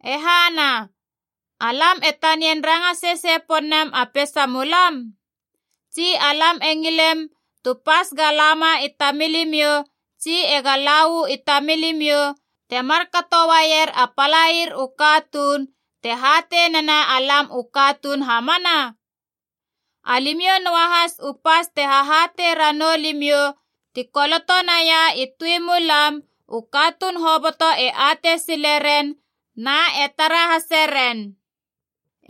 E hana, alam e tanian ranga sesei pon nem a peisamulam? Tsi alam e ngilem tu pas ga lama i tamilimiou tsi ega la uu i tamilimiou, temar katouaier a palair u katuun, te hatei nena alam u katuun hamana? Alimiou noahas u pas te hahatei ranou limiou ti koloto naia i tui mulam, u katuun hoboto e atei sileren na e tara hase ren.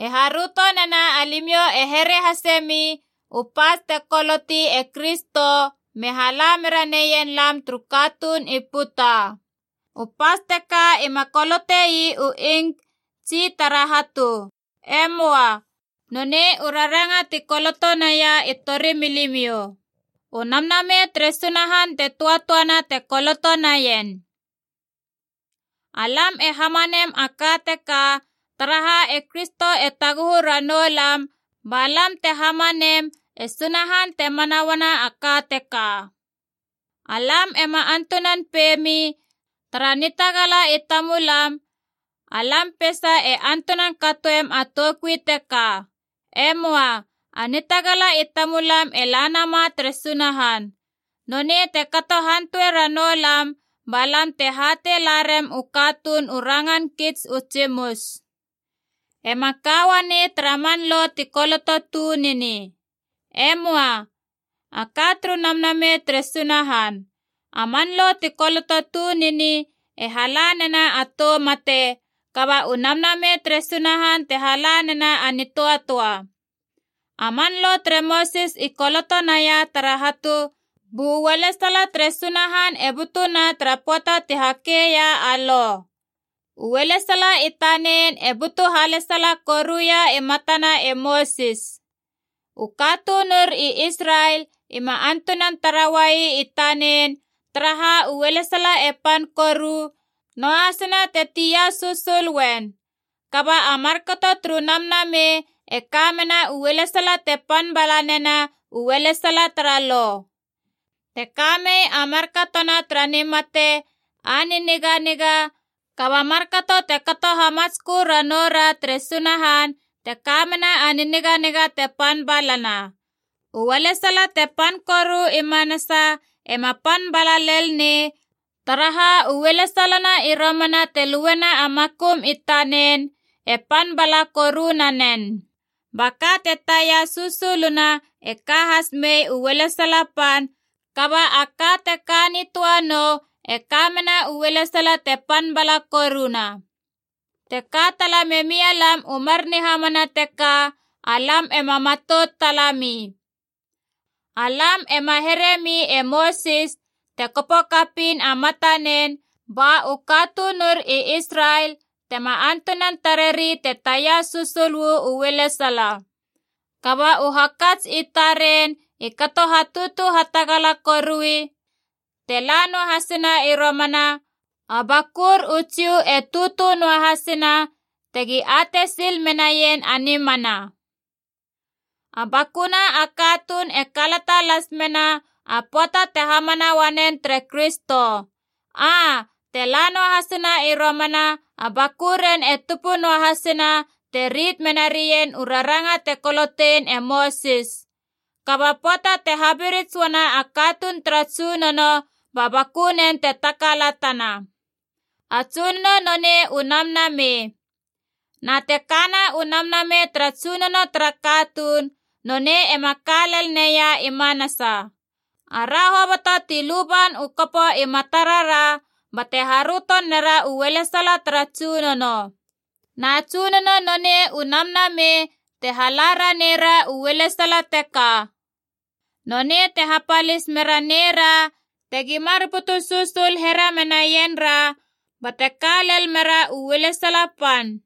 E haröto nena alimiou e here hasemi u pas te koloti e Kristo me hala mera neien lam turu katuun i puta. U pas teka ima kolotei u ink tsi tara hatu. E möa. Nonei u raranga ti koloto naia i torimilimiou. U Namnamei tere Sunahan te töatöana te koloto naien. Alam e hamanem a ka teka, taraha e Kristo e taguhu ranou lam ba lam te hamanem e Sunahan te mana uana a ka teka. Alam ema antunan peiemi, tara nitagala i tamulam, alam peisa e antunan katoem a toukui teka. E möa. A nitagala i tamulam e la nama tere Sunahan. Nonei te kato hantuea ranou lam ba lam te hatei la rem u katuun u rangan kits u tsimus. Ema ka uanei tara man Lo ti koloto tunini. E möa, a ka turu Namnamei tere Sunahan. A man Lo ti koloto tunini e hala nena a tou mate, kaba u Namnamei tere Sunahan te hala nena a nitöatöa. A man Lo tere Mosis i koloto naia tara hatu, bu ualesala tere Sunahan e butuna tara pöata ti hakeia a Lo. U ualesala i tanen e butu halesala koruia i matana e Mosis. U katunur i Israel ima antunan tara uai i tanen, taraha ualesala e pan koru, noahasina te tia susul uen. Kaba a markato turu Namnamei e ka mena u ualesala te pan bala nena u ualesala tara Lo. Te kamei a markatona tara nimate a niniganiga, kaba markato te kato hamatskö ranoura tere Sunahan te kamena a niniganiga te pan balana. U ualesala te pan koru i manasa ema pan bala lel nei, taraha u ualesalana i romana te luena a makum i tanen, e pan bala koru nanen. Ba ka te taia susuluna e ka has mei u ualesala pan, kaba a ka teka nitöa nou e ka mena u ualesala te pan bala koruna. Te ka tala memialam u mar nihamana teka alam ema matout tala mi. Alam ema heremi e Mosis te kopo kapiin a matanen ba u katunur i Israel tema antunan tareri te taia susul uu ualesala. Kaba u hakats i taren i kato hatutu hatagala korui, te la noahasina i romana, a bakur u Jiu e tutu noahasina tegi atei sil menaien a nimana. A bakuna a katuun e kalata las mena a pöata te hamana uanen tere Kristo. Aa, te la noahasina i romana, a bakuren e tupu noahasina te rit mena rien u raranga te kolotein e Mosis. Kaba pöata te habirits uana a katuun tara Tsunono, ba bakunen te takalatana. A Tsunono nonei u Namnamei. Na te kana u Namnamei tara Tsunono tara katuun, nonei ema ka lel neia i manasa. Ara hoboto ti luban u kopo i matarara bate haröto nera u ualesala tara Tsunono. Na Tsunono nonei u Namnamei te hala raneira u ualesala teka. Nonei te hapalis mera neira tegi mar butu susul here menaien ra bate ka lel mera u ualesala pan.